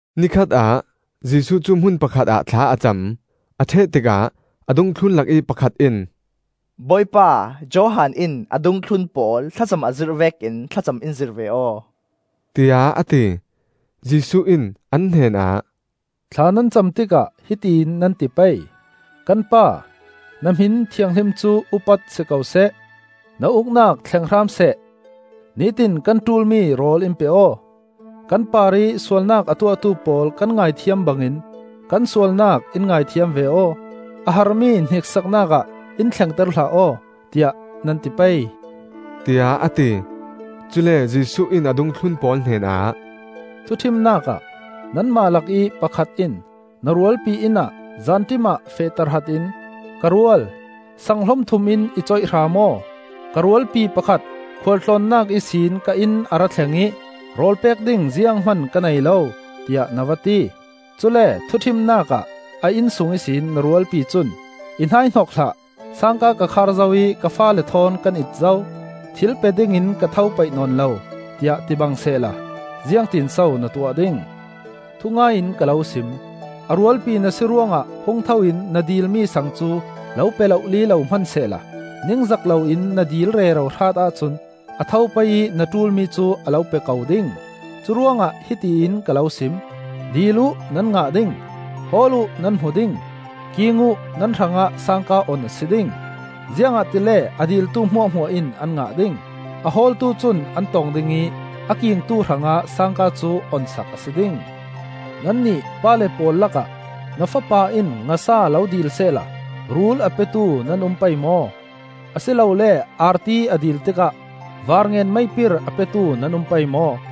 Ni khatah Jesuh cu hmun pakhat ah thla a cam. A ṭheh tikah a dungthlun lakih pakhat in, “Bawipa, Johan in a dungthlun pawl thlacam a zirh vekin thlacam in zirh ve aw,” tiah a ti. Jesuh in an hnenah, “Thla nan cam tikah hiti in nan ti pei: ‘Kan Pa, Na hmin thianghlim cu upat si ko seh, Na Uknak thleng hram seh. Nitin kan ṭulmi rawl in pe aw. Kan parih sualnak a tuahtu pawl kan ngaithiam bangin, kan sualnak in ngaithiam ve aw. A harmi hniksaknak ah in thlengter hlah aw,’ tiah nan ti pei,” tiah a ti. Cule Jesuh in a dungthlun pawl hnenah, “Thuṭhimnak ah nanmah lakih pakhat in na rualpi inn ah zanṭim ah feh tahratin ‘Ka rual, sang hlom thum in i coih hram aw. Ka rualpi pakhat khualtlawnnak ihsin ka inn a ra thleng ih rawl pek ding zianghman ka nei lo,’ tiah na va ti. Cule thuṭhimnak ah a innsung ihsin na rualpi cun ‘I hnaihnok hlah. sangka ka khar zo ih ka faale thawn kan it zo; thil pe dingin ka tho paih nawn lo,’ tiah ti bang sehla, ziangtinso na tuah ding? Thungai in ka lo sim: a rualpi na si ruangah hung tho in na dilmi saang cu lo pe lohli lo hmansehla ningzak loin na dil rero hrat ahcun a tho pei ih na ṭulmi cu a lo pe ko ding. “Curuangah hiti in ka lo sim: dil uh, nan ngah ding; hawl uh nan hmu ding; king uh, nan hrangah sangka on a si ding. Ziangahtile a diltu hmuahhmuah in an ngah ding, a hawltu cun an tong ding ih a kingtu hrangah sangka cu onsak a si ding. Nannih pale pawl lakah na fapa in ngasa lo dilsehla rul a petu nan um pei maw? Asilole arti a dil tikah varngen-meipir a petu nan um pei maw?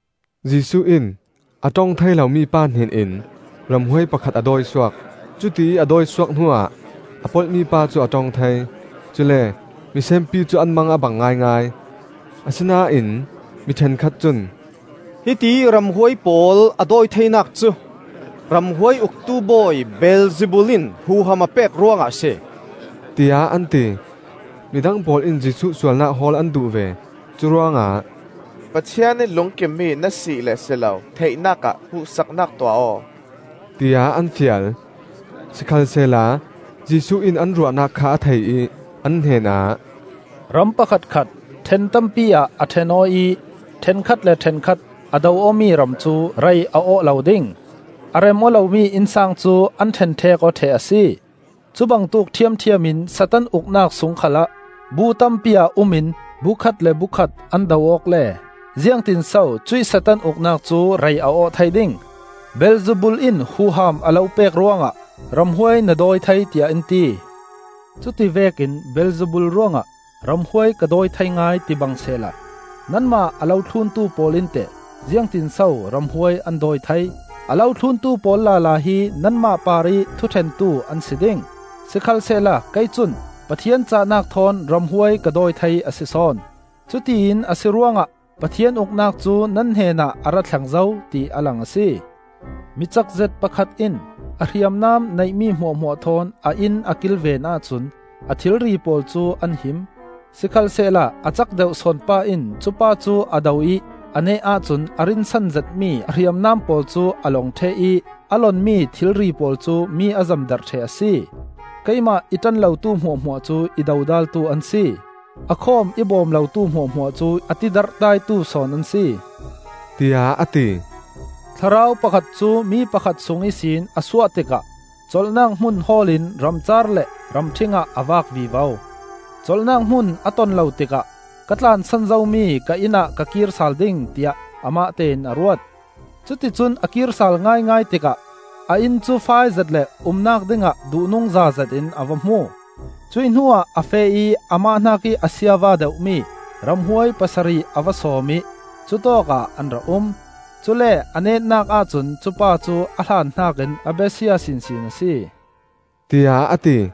Jesuh in a ṭong thei lo mipa hnenin ramhuai pakhat a dawi suak; cutiih a dawi suak hnuah a polh mipa cu a ṭong thei. Cule misenpi cu an mang a bang ngaingai. Asinain mi ṭhenkhat cun, “Hitiih ramhuai pawl a dawi theinak cu ramhuai uktu bawi Beelzebul in huham a pek ruangah a si,” tiah an ti. Midang pawl in Jesuh sualnak hawl an duh ve; curuangah, “Pathian ih lungkim mi na si le si lo theihnak ah hmuhsaknak tuah aw,” tiah an fial. Sikhalsehla Jesuh in an ruahnak kha a thei ih an hnenah, “Ram pakhatkhat ṭhen tampi ah a ṭhen aw ih ṭhenkhat le ṭhenkhat a do awmi ram cu rei a awh lo ding; a rem aw lomi innsang cu an ṭhenṭhek aw ṭheh a si. Cubangtuk ṭhiamṭhiam in Satan uknak sung khalah bu tampi ah um in bu khat le bu khat an do awk le ziangtinso cuih Satan uknak cu rei a awh thei ding? ‘Beelzebul in huham a lo pek ruangah ramhuai na dawi thei,’ tiah in ti. Cuti vekin Beelzebul ruangah ramhuai ka dawi thei ngai ti bang sehla, nanmah a lo thluntu pawl in teh ziangtinso ramhuai an dawi thei? A lo thluntu pawl lala hi nanmah parih thuṭhentu an si ding. Sikhalsehla kei cun Pathian cahnak thawn ramhuai ka dawi thei a si sawn; cutiin a si ruangah Pathian Uknak cu nan hnenah a ra thleng zo, ti a lang a si. “Mi cakzet pakhat in a hriamnam neihmi hmuahhmuah thawn a inn a kilven ahcun a thilri pawl cu an him. Sikhalsehla a cak deuh sawn pa in cupa cu a do ih a neh ahcun a rinsan zetmi a hriamnam pawl cu a lawng ṭheh ih a lonmi thilri pawl cu mi a zemdarh ṭheh a si. “Keimah i ṭan lotu hmuahhmuah cu i dodaltu an si; a khawm i bawm lotu hmuahhmuah cu a ti darhdaitu sawn an si,” tiah a ti. “Thlarau pakhat cu mi pakhat sung ihsin a suah tikah colhnak hmun hawl in ramcaar le ramṭhing ah a vak vivo. Colhnak hmun a ton lo tikah ‘Ka tlansan zomi ka inn ah ka kir sal ding,’ tiah amah tein a ruat. Cuticun a kir sal ngaingai tikah a inn cu faizet le umnak dingah duhnungza zetin a va hmu. Cuih hnuah a feh ih amah hnakih a siava deuhmi ramhuai pasarih a va sawm ih cutawkah an ra um. Cule a netnak ahcun cupa cu a hlan hnakin a besia sinsin a si,” tiah a ti.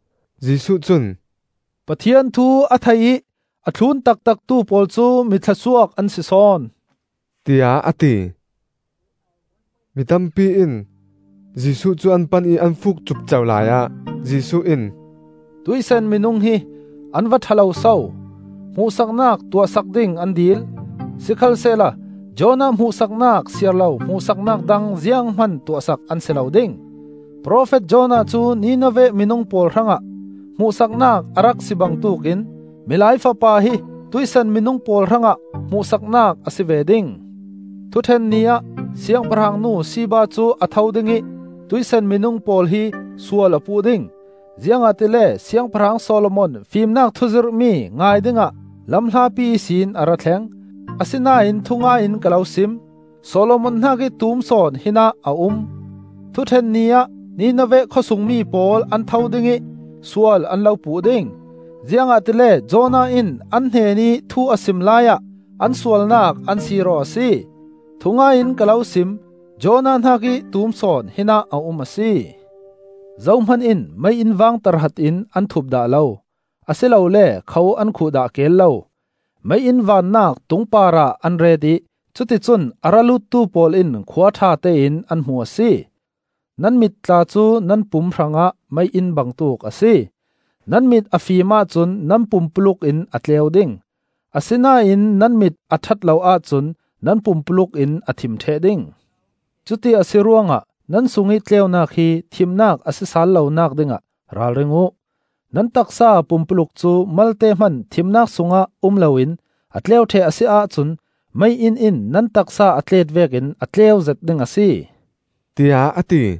Jesuh cun, “Pathian thu a thei ih a thlun taktaktu pawl cu mi thlawsuak an si sawn,” tiah a ti. Mitampi in Jesuh cu an pan ih an fuuk cupco laiah Jesuh in, “Tuih san minung hi an va ṭha loso! Hmuhsaknak tuahsak ding an dil, sikhalsehla Jonah hmuhsaknak siar lo hmuhsaknak dang zianghman tuahsak an si lo ding. Profet Jonah cu Nineveh minung pawl hrangah hmuhsaknak a rak si bangtuk in Milai Fapa hi tuih san minung pawl hrangah hmuhsaknak a si ve ding. Thuṭhen Ni ah Siangpahrangnu Sheba cu a tho ding ih tuih san minung pawl hi sual a puh ding, ziangahtile Siangpahrang Solomon fimnak thuzirhmi ngai dingah lamhlapi ihsin a ra thleng; asinain thungai in ka lo sim: Solomon hnakih tum sawn hinah a um. Thuṭhen Ni ah Nineveh khawsung mi pawl an tho ding ih sual an lo puh ding, ziangahtile Jonah in an hnenih thu a sim laiah an sualnak an sir aw a si; thungai in ka lo sim: Jonah hnakih tum sawn hinah a um a si. “Zohman in mei-inn vang tahratin an thup dah lo, a si lole kho an khuh dah keel lo; mei-inn vannak tung parah an ret ih cuticun a ra luttu pawl in khua ṭhatein an hmu a si. Nan mit tla cu nan pum hrangah mei-inn bangtuk a si. Nan mit a fim ahcun nan pumpuluk in a tleu ding, asinain nan mit a ṭhat lo ahcun nan pumpuluk in a thim ṭheh ding. Cuti a si ruangah nan sungih tleunak hi thimnak a si sal lonak dingah ralring uh. Nan taksa pumpuluk cu malte hman thimnak sungah um loin a tleu ṭheh a si ahcun mei-inn in nan taksa a tlet vekin a tleuzet ding a si,” tiah a ti.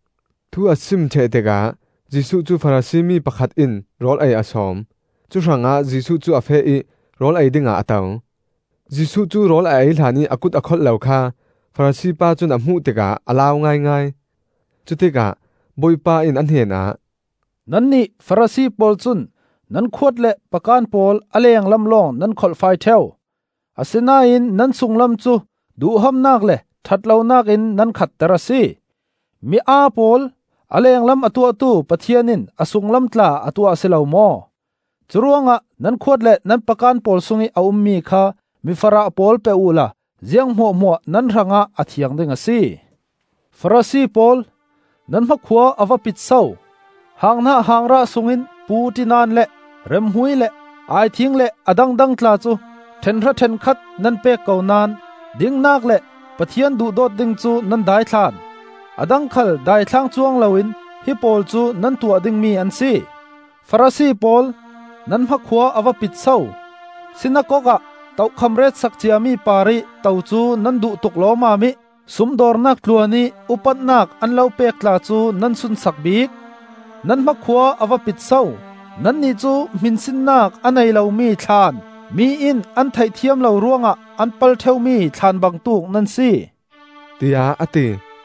Thu a sim ṭheh tikah Jesuh cu Farasi mi pakhat in rawl ei a sawm; cuhrangah Jesuh cu a feh ih rawl ei dingah a to. Jesuh cu rawl a ei hlanih a kut a kholh lo kha Farasi pa cun a hmuh tikah a lau ngaingai. Cutikah Bawipa in a hnenah, “Nannih Farasi pawl cun nan khuat le pakan pawl a lenglam lawng nan kholhfai ṭheu, asinain nan sunglam cu duhhamnak le ṭhat lonak in nan khahter a si. Mi aa pawl! A lenglam a tuahtu Pathian in a sunglam tla a tuah a si lo maw? Curuangah nan khuat le nan pakan pawl sungih a ummi kha mi farah pawl pe uhla ziang hmuahhmuah nan hrangah a thiang ding a si. Farasi pawl, nan hmakhua a va pit so! Hanghnah hangrah sungin puṭinan le remhmui le aithing le a dangdang tla cu ṭhenhra ṭhenkhat nan pek ko naón dingnak le Pathian duhdawt ding cu nan daithlan. A dang khal daithlang cuang loin hi pawl cu nan tuah dingmi an si. Farasi pawl, nan hmakhua a va pit so! Sinakok ah tokham ret sak ciami parih to cu nan duh tuk lawmmam ih sumdawrnak tluan ih upatnak an lo pek tla cu nan sunsak bik. Nan hmakhua a va pit so! Nannih cu hminsinnak a nei lomi thlaan, mi in an theih thiam lo ruangah an pal ṭheu mi thlaan bangtuk nan si,” tiah a ti.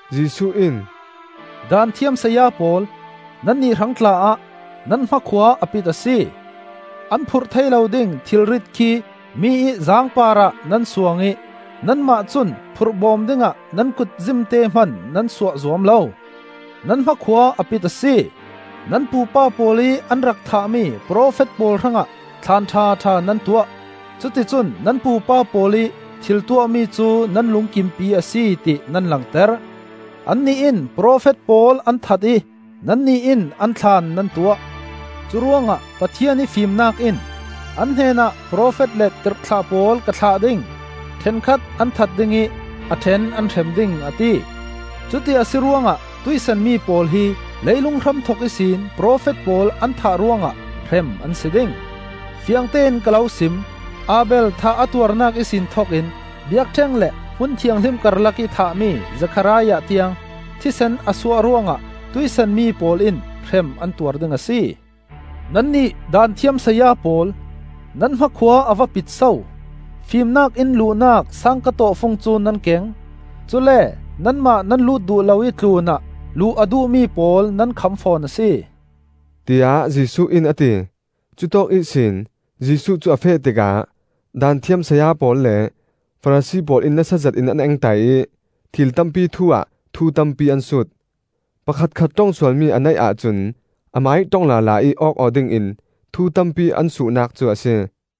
Jesuh in, “Daanthiam saya pawl, nannih hrang tla-ah nan hmakhua a pit a si! An phurh thei lo ding thilrit khi mi ih zaang parah nan suang ih nanmah cun phurh bawm dingah nan kut zimte hman nan suah zuam lo. Nan hmakhua a pit a si! Nan pupa pawl ih an rak thahmi profet pawl hrangah thlaan ṭhaṭha nan tuah. Cuticun nan pupa pawl ih thil tuahmi cu nan lungkimpi a si ti nan langter; annih in profet pawl an that ih nannih in an thlaan nan tuah. Curuangah Pathian ih Fimnak in ‘An hnenah profet le tirhthlah pawl ka thlah ding; ṭhenkhat an that ding ih a ṭhen an hrem ding,’ a ti. Cuti a si ruangah tuih san mi pawl hi leilung hramthok ihsin profet pawl an thah ruangah hrem an si ding. Fiangtein ka lo sim: Abel thah a tuarnak ihsin thokin biakṭheng le Hmun Thianghlim karlakih an thahmi Zekhariah tiang, thisen a suah ruangah tuih san mi pawl in hrem an tuar ding a si. Nannih Daanthiam saya pawl, nan hmakhua a va pit so! Fimnak inn luhnak sangka tawhfung cu nan keng; cule nanmah nan lut duh lo ih tlunah luh a duhmi pawl nan kham fawn a si,” tiah Jesuh in a ti. Cutawk ihsin Jesuh cu a feh tikah Daanthiam saya pawl le Farasi pawl in nasa zetin an engtai ih thil tampi thu ah thu tampi an sut; pakhatkhat ṭong sualmi a neih ahcun amah ih ṭong lala ih awk aw dingin thu tampi an suhnak cu a si.